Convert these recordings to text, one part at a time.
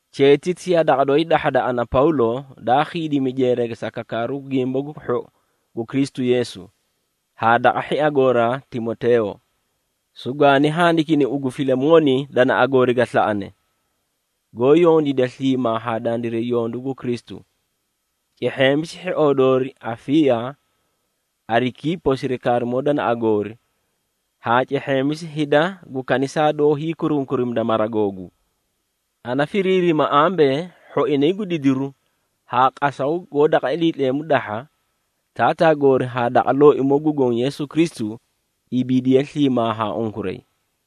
Cheetiti yaa daqa dooi dahhada ana Pawlo, daa khiidimi jeerage sa kakaaru Gimba gu Hhou gu Kristu Yeesu, haa daqa hhia gooraa Timoteeyo. Sugwaani handikini ugu Filimooni danaꞌa goori ga slaꞌane, goó yondiida sliimaa haa dandiray yondu gu Kristu. Cehheemisi hhioo doori Afiiya, Arikiipo sirikaarimoo danaꞌa goori haa cehheemisi hida gu kanisaa doó hiikurunkurimida mara googuu. Ana firiirima ambee, hhoinay gu didiru haa qasaw goó daqa Iliitleemu dahha, Taataa goori haa daqa Looimoo gu Goõ Yeesu Kristu, ibiidiye sliimaa haa unkuray.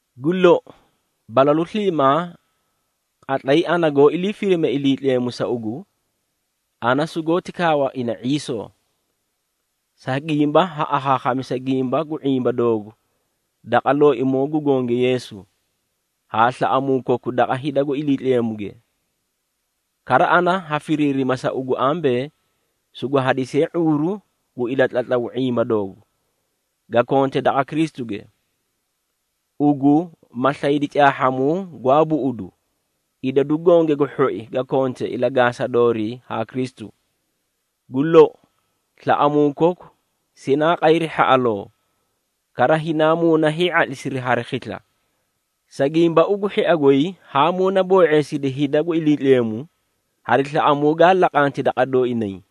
Gu lou, balalu sliimaa, qatlay ana goó ilii firime Iliitleemu sa ugu, ana sugoóti kaawa ina ⁄iisoo. Sa gimba ha akhaakhamisa, gimba gu ⁄imba doogu daqa Looimoo gu Gonge Yeesu, haa slaꞌamuu koku daqa hida gu Iliitleemuge. Kara ana ha firiirima sa ugu ambee, sugu hadisiye ⁄uuru gu ilatlatlaw ⁄imba doogu, ga konte daqa Kristuge. Ugu ma slayidi caahhamuu gwaa buꞌudu, idadu gonge gu hhoi ga kone ilagaasa doorii haa Kristu. Gu lou, slaꞌamuu koku sinaa qayri hhaꞌaloo, kara hinaa muuna hii⁄atlisiri hari khisla, sa gimba ugu hhia goy haa muunaboo⁄eesidi hida gu Iliitleemu, hari slaꞌamuu gaa laqanti daqa dooinay.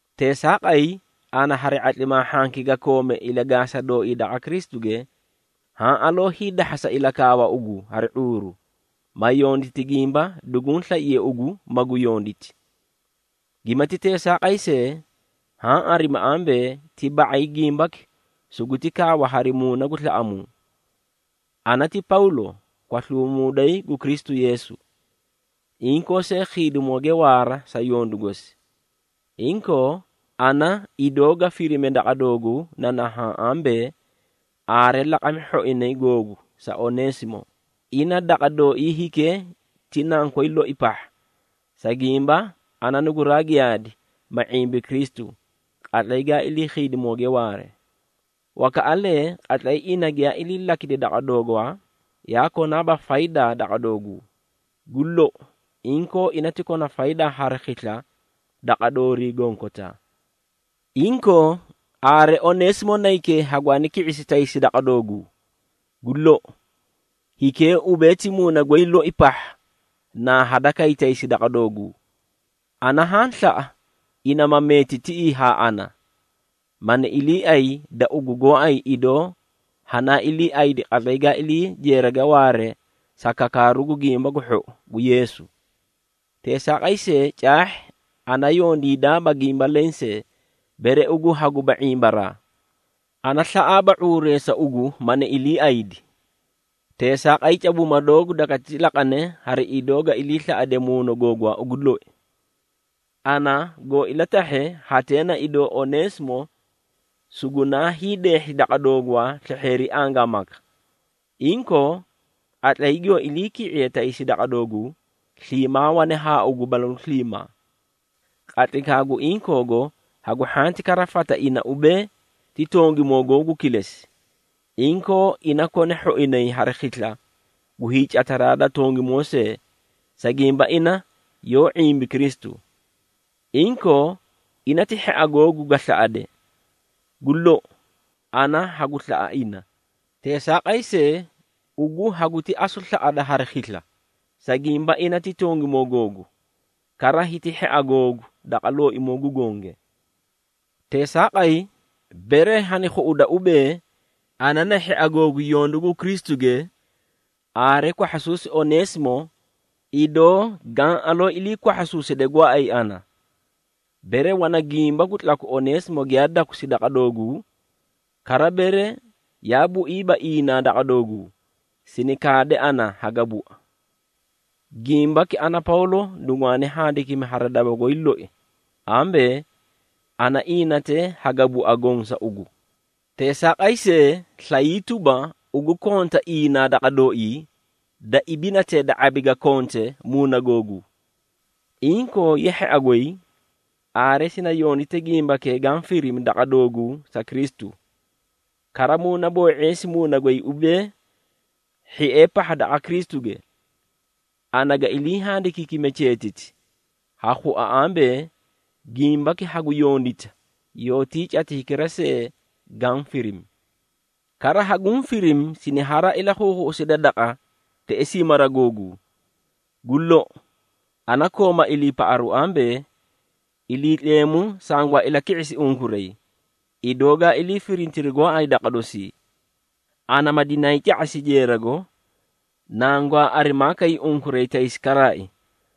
Teesaaqay, ana hari ⁄atlimaa hhanki ga koome ilagaasaraa dooi daqa Kristuge, haã aloo hiidahasa ilakaawa ugu hari ⁄uuru, ma yonditi gimba duguũ slaiye ugu magu yonditi. Gimati teesaaqay see, haã arimi ambee, ti ba⁄ay gimbaki suguti kaawa hari muuna gu slaꞌamuu. Ana ti Pawlo, kwasluumuuday gu Kristu Yeesu, inkoo see khiidimooge waara sa yondu gosi. Inkoo, ana idoo ga firime daqa dooguu na nahaã ambee, aare laqami hhoinay googu sa Oneesimo. Ina daqa dooii hikee ti nankoy loi pahha, sa gimba ana nuguraa giyaadi, ma ⁄imbi Kristu, qatlay ga ilii khiidimooge waare. Wakaꞌalee, qatlay ina giyaa ilii lakidi daqa doogwaa, yaa konaaba faydaa daqa dooguu. Gu lou, inkoo ina ti kona faydaa hari khisla daqa doorii gonkotaa. Inkoo, aare Oneesimo naykee hagwaani ki⁄isi taysi daqa dooguu. Gu lou, hikee ubee ti muuna goy loi pahha naa hadakay taysi daqa dooguu. Ana haã slaꞌa, ina ma meeti tiꞌii haa ana, mani iliiay da ugu gooay idoo hanaa iliiaydi, qatlay ga ilii jeerage waare sa kakaaru gu Gimba gu Hhou gu Yeesu. Teesaaqay see caahhi, ana yondiidaaba gimba lensee, bere ugu haguba ⁄imbaraa. Ana slaꞌaaba ⁄uureesa ugu mani iliiaydi, teesaaqay cabuuma doogu dagati laqane hari idoo ga iliislaꞌade muuna googwaa ugu loi. Ana goo ilatahhe, hatee na idoo Oneesimo sugunaa hiideehhi daqa doogwaa slehheeri angaamaka. Inkoo, qatlay giyoo iliiki⁄iye taysi daqa dooguu, sliimaa wane haa ugu balalu sliimaa. Qatlaykaa gu inkoogo, hagu hhanti kara fata ina ubee, ti tongimoo googu kilesi. Inkoo ina kona hhoinay hari khisla gu hiicataraa da tongimoo see, sa gimba ina yoó ⁄imbi Kristu. Inkoo ina ti hhia googu ga slaꞌade. Gu lou, ana hagu slaꞌa ina, teesaaqay see, ugu haguti asu slaꞌada hari khisla, sa gimba ina ti tongimoo googu, kara hiti hhia googu daqa Looimoo gu Gonge. Teesaaqay, bere hani khuꞌuda ubee, ana na hhia googu yondu gu Kristuge, aare kwahhasuusi Oneesimo idoo gaã aloo ilii kwahhasuuside gooay ana. Bere wana gimba gu tlaku Oneesimo giyaa dakusi daqa dooguu, kara bere yaa buiiba inaa daqa dooguu, sini kaade ana haga bua. Gimbaki ana Pawlo nugwaani handikimi hari daba goy loi ambee, ana iinatee haga bua goõ sa ugu. Teesaaqay see, slayii tuba, ugu konta inaa daqa dooii, da ibinatee da ⁄abi ga konte muuna googuu. Inkoo ye hhia goy, aare sini yondite gimbakee gaã firimi daqa dooguu sa Kristu. Kara muunaboo⁄eesi muuna goy ubee, hhiee pahha daqa Kristuge. Ana ga ilii handikiikime cheetiti, ha khua ambee, gimbaki hagu yondita, yoótii cati hikira see gaã firimi. Kara haguũ firimi siniharaa ilakhuukhuꞌuside daqa, teꞌesii mara googuu. Gu lou, ana kooma iliipaꞌaru ambee, Iliitleemu sangwaa ilaki⁄isi unkuray, idoo gaa ilii firintiri gooay daqa dosii, ana ma dinaay ca⁄asi jeerago, nangwaa arimaa kay unkuray taysi karaai.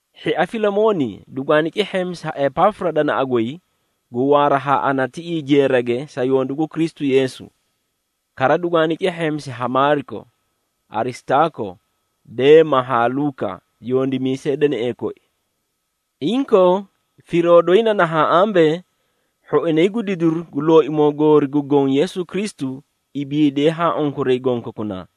Hhia Filimooni, dugwaani cehheemisi ha Epaafura danaꞌa goy, gu waara haa ana tiꞌii jeerage sa yondu gu Kristu Yeesu. Kara dugwaani cehheemisi ha Maariko, Arisitaako, Deema haa Luuka, yondimiisee deneꞌee koi. Inkoo firoo doyi na nahaã ambee, hhoinay gu didiru gu Looimoo goori gu Goõ Yeesu Kristu ibiidiyee haa unkuray gonkokunaa.